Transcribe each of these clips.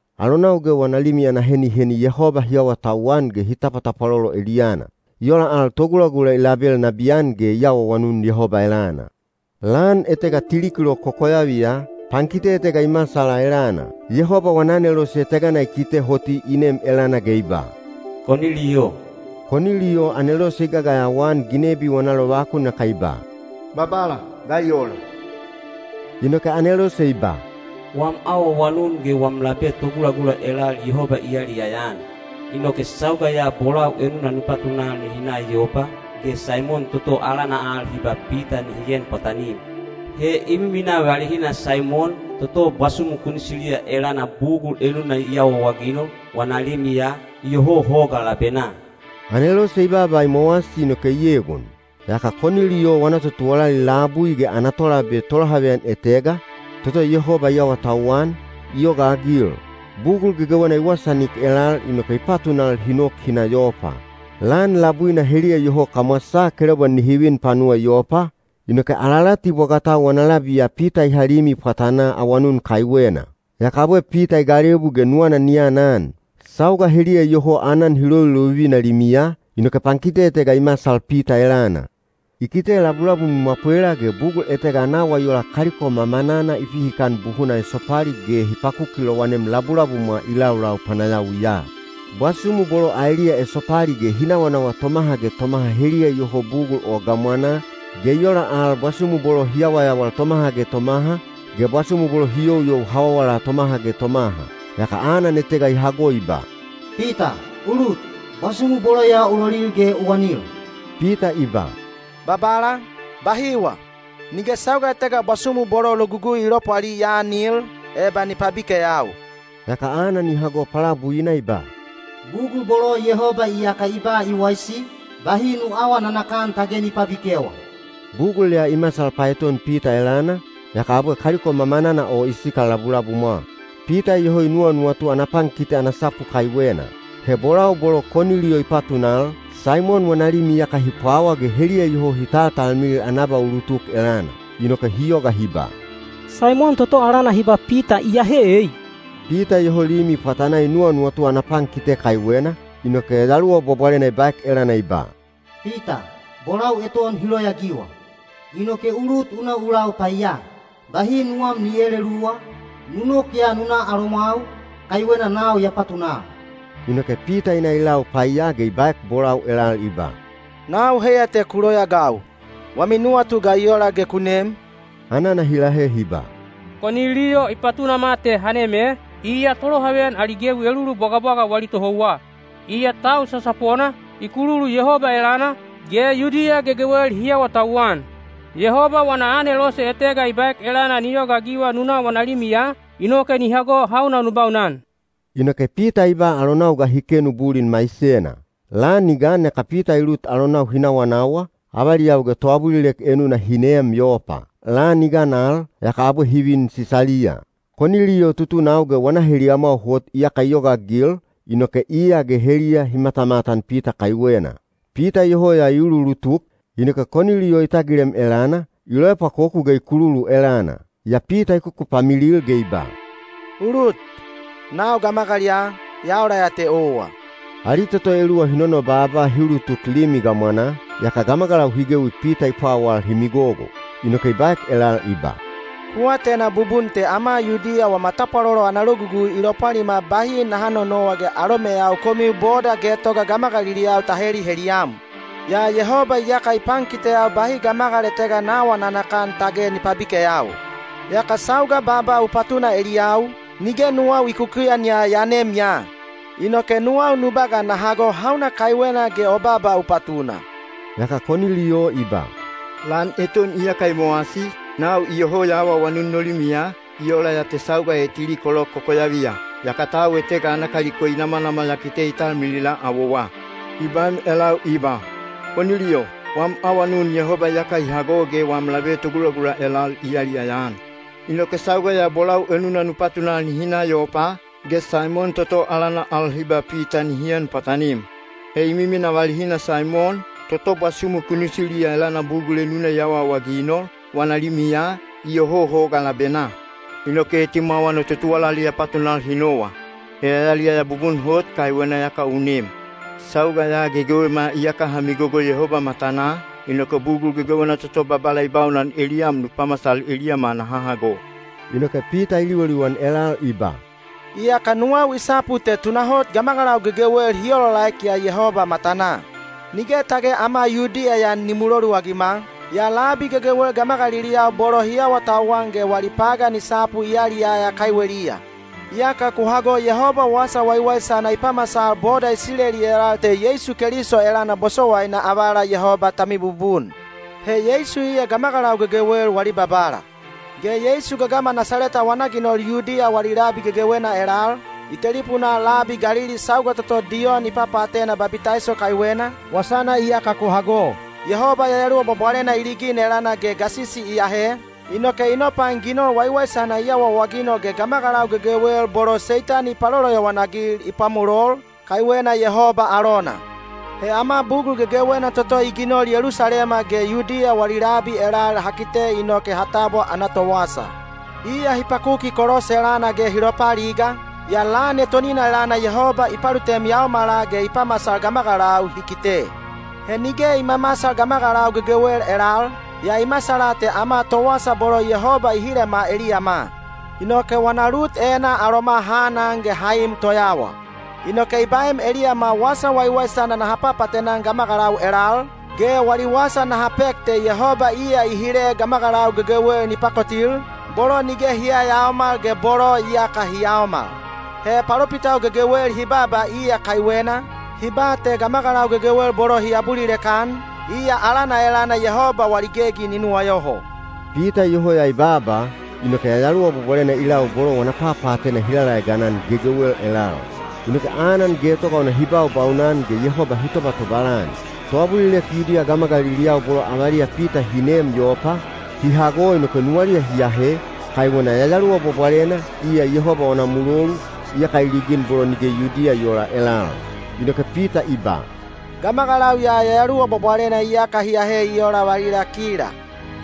Alonau ge wana limi ana heniheni Yehoba hi awatauwan ge hi tapwatapwalolo eliyana. I ola al togulagula i label nabiyan ge i awaawanun Yehoba elana. Lan etega tili kilok kokoyaviya, pankite etega i masala elana. Yehoba wana anelose etegana i kite hoti i nem elana ge i ba, “Koniliyo.” Koniliyo anelose i gagayawa-an ginebi wana lovakun yaka i ba, “Babala, ga i ola?” Inoke anelose i ba, “Wam awaawanun ge wam labe togulagula elal Yehoba i yaliyaya-an. Inoke sauga ya bolau enuna nu patunal nihi na Yopa, ge Saimon toto alana al hi ba Pita nihi en pwatanim. He i miminaa valihina Saimon, toto bwasumu kunisiliya elana bugul enuna i awaawaginol, wana limiya, iyoho hoga labenaa.” Anelose i baaba i mowasi inoke i egon. Yaka Koniliyo wana totuwalali labui ge ana tolabe tolohaveyan etega, toto Yehoba i awatauwan, i yogaagil. Bugul gegewena i wasaanik elal inoke i patunal hi nok hi na Yopa. Lan labuina heliya iyoho kamwasaa kelaubwa nihi vin panuwa Yopa, inoke alalati bwagatau wana labiya Pita i ha limi pwatanaa awanun kaiwena. Yaka abwe Pita i galebu ge nuwana ni anan. Sauga heliya iyoho aanan hi lovilovivina limiya, inoke pankite etega i masal Pita elana. I kite labulabum i mwapwela ge bugul etega ana awa i ola kaliko mamanana hi pihikana buhuna esopali ge hi pakuki lowanem labulabumwa i laulau panayawiya. Bwasumu bolo aeliya esopali ge hi nawanawa tomaha ge tomaha heliya iyoho bugul o gamwanaa, ge i ola al bwasumu bolo hi yawayawal tomaha ge tomaha, ge bwasumu bolo hi youyou hawawala tomaha ge tomaha. Yaka anan etega i hago i ba, “Pita, u lut, bwasumu bolo ya u lolil ge u anil.” Pita i ba, “Babala, bahiwa! Nige sauga etega bwasumu bolo Logugui i lopwali ya aanil, eba ni pabikeyau.” Yaka anan i hago palabuina i ba, “Bugul bolo Yehoba iyaka i ba i waisi, bahi nu aawa nanakan tage ni pabikewa.” Bugul ya i masal paeton Pita elana, yaka abwe kaliko mamanana o i sikal labulabumwa. Pita iyoho i nuwanuwatu ana pankite ana sapu kaiwena. He bolau bolo Koniliyo i patunal, Saimon wana limi iyaka hi pwawa ge heliya iyoho hi taltalmilil ana abaulutuk elana. Inoke hi yoga hi ba, “Saimon toto alana hi ba Pita iyahe ei?” Pita iyoho limi pwatanaa i nuwanuwatu ana pankite kaiwena, inoke Yayaluwa Bwabwalena i baek elana i ba, “Pita, bolau eton hi loyaagiwa. Inoke u lut u na u lau paiya. Bahi nuwam ni eeleluwa, nu nok ya nu na alomwau, kaiwena nau ya patunal.” Inoke Pita i na i lau paiya ge i baek bolau elal i ba, “Nau heiya te ku loyaagau. Wami nuwatu ga i ola ge ku nem?” Anana hi lahe hi ba, “Koniliyo i patunama te ha nem e, iya tolohaveyan ali gewi elulu bwagabwaga wali tohouwa. Iya tau sasapona, i kululu Yehoba elana, ge Yudiya gegewel hi awatauwan. Yehoba wana anelose etega i baek elana ni yogaagiwa nu na wana limiya, inoke ni hago hauna nu baunan.” Inoke Pita i ba alonau ga hi kenu bulin maisena. Lan i gan yaka Pita i lut alonau hi nawanawa, avaliyau ge toabulilek enuna hi neem Yopa. Lan i gan al, yaka abwe hi vin Sisaliya. Koniliyo tutunau ge wana heliyamwau hot iyaka i yogaagil, inoke iya ge heliya hi matamatan Pita kaiwena. Pita iyoho ya i uluulutuk, inoke Koniliyo i tagilem elana, i loepwakoku ge i kululu elana. Yaa Pita i kukupamilil ge i ba, “U lut, nau gamagal ya, ya ola ya te owa.” Ali toto eluwa hi nonobaaba hi ulutuk limi gamwanaa, yaka gamagalau hi gewi Pita i pwawal hi migogo. Inoke i baek elal i ba, “Ku atena bubun te ama Yudiya wama tapwalolo ana logugui i lopwalima bahi naha nonowa ge alomeyau komiu boda getoga gamagaliliyau ta heliheliyam. Yaa Yehoba iyaka i pankiteyau bahi gamagal etega na aawa nanakan tage ni pabikeyau. Yaka sauga baaba u patuna eliyau, nige nuwau i kukuyan yaa ya nem ya. Inoke nuwau nu ba ga na hago hauna kaiwena ge o baaba u patuna.” Yaka Koniliyo i ba, “Lan eton iyaka i mowasi, nau iyoho ya awaawanun no limiya, i ola ya te sauga e tili kilok kokoyaviya. Yaka tau etega ana kaliko i namanamal ya kite i talmilila awowa. I baem elau i ba, ‘Koniliyo, wam awanun Yehoba iyaka i hago ge wam labe togulagula elal i yaliyaya-an. Inoke sauga ya bolau enuna nu patunal nihi na Yopa, ge Saimon toto alana al hi ba Pita nihi en pwatanim. He i miminaa valihina Saimon, toto bwasumu kunisiliya elana bugul enuna i awaawaginol, wana limiya, iyoho hoga labenaa.’ Inoke etimwawa no totuwalali ya patunal hi nowa. He ya yaliyaya bubun hot kaiwena iyaka u nem. Sauga ya gegewema iyaka ha migogo Yehoba matanaa, inoke bugul gegewena toto Babala i baunan eliyam nu pamasal eliyama naha hago.” Inoke Pita i liwaliwan elal i ba, “Iyaka nuwau i sapu te tunahot gamagalau gegewel hi olaolaek ya Yehoba matanaa. Nige tage ama Yudiya ya ni muloluagima, yaa labi gegewel gamagaliliyau bolo hi awatauwan ge wali pagan i sapu i yaliyaya kaiweliya. Iyaka ku hago Yehoba wasa waiwaisana i pamasal boda Isileli elal te Yeisu Keliso elana bosowaina avala Yehoba ta mibubun. He Yeisu iya gamagalau gegewel wali Babala. Ge Yeisu gagama Nasaleta wana ginol Yudiya wali labi gegewena elal, i telipunaa labi Galili sauga toto Diyon i papaatena babitaiso kaiwena, wasana iyaka ku hago. Yehoba Yayaluwa Bwabwalena i ligin elana ge gasisi i ahe, inoke i nopain ginol waiwaisana i awaawaginol ge gamagalau gegewel bolo Seitani i paloloyowan-agil i pwamolol, kaiwena Yehoba alona. He ama bugul gegewena toto i ginol Yelusalema ge Yudiya wali labi elal ha kite inoke ha tabwa ana towasa. Iya hi pakuki kolos elana ge hi lopaaliga, yaa lan etonina elana Yehoba i palutem yaomala ge i pamasal gamagalau hi kite. He nige i mamasal gamagalau gegewel elal, yaa i masala te ama towasa bolo Yehoba i hilema eliyama. Inoke wana lut enaa aloma ha anan ge ha im toyawa. Inoke i baem eliyama wasa waiwaisana naha papaatena-an gamagalau elal, ge wali wasa naha pek te Yehoba iya i hile gamagalau gegewel ni pakotil, bolo nige hi yayaomal ge bolo iyaka hi yaomal. He palopitau gegewel hi baaba iya kaiwena, hi ba te gamagalau gegewel bolo hi abulilek-an, iya alana elana Yehoba wali gegi ni nuwayoho.” Pita iyoho ya i baaba, inoke Yayaluwa Bwabwalena i lau bolo wana papaatena hi lalaegan-an gegewel elal. Inoke anan getoga ona hi baubaunan ge Yehoba hi tobatobal-an. Toabulilek Yudiya gamagaliliyau bolo avaliya Pita hi neem Yopa, hi hago inoke nuwaliya hi ahe, kaiwena Yayaluwa Bwabwalena, iya Yehoba wana mulolu, iyaka i ligin bolo nige Yudiya i oola elal. Inoke Pita i ba, “Gamagalau ya Yayaluwa Bwabwalena iyaka hi ahe i ola valila kila.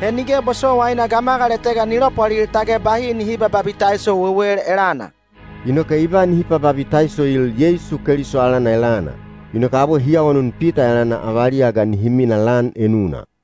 He nige bosowaina gamagal etega ni lopwalil tage bahi nihi babitaiso wewel elana.” Inoke i ba nihi pababitaisoil Yeisu Keliso alana elana. Inoke abwe hi awanun Pita elana avaliya ga nihi mina lan enuna.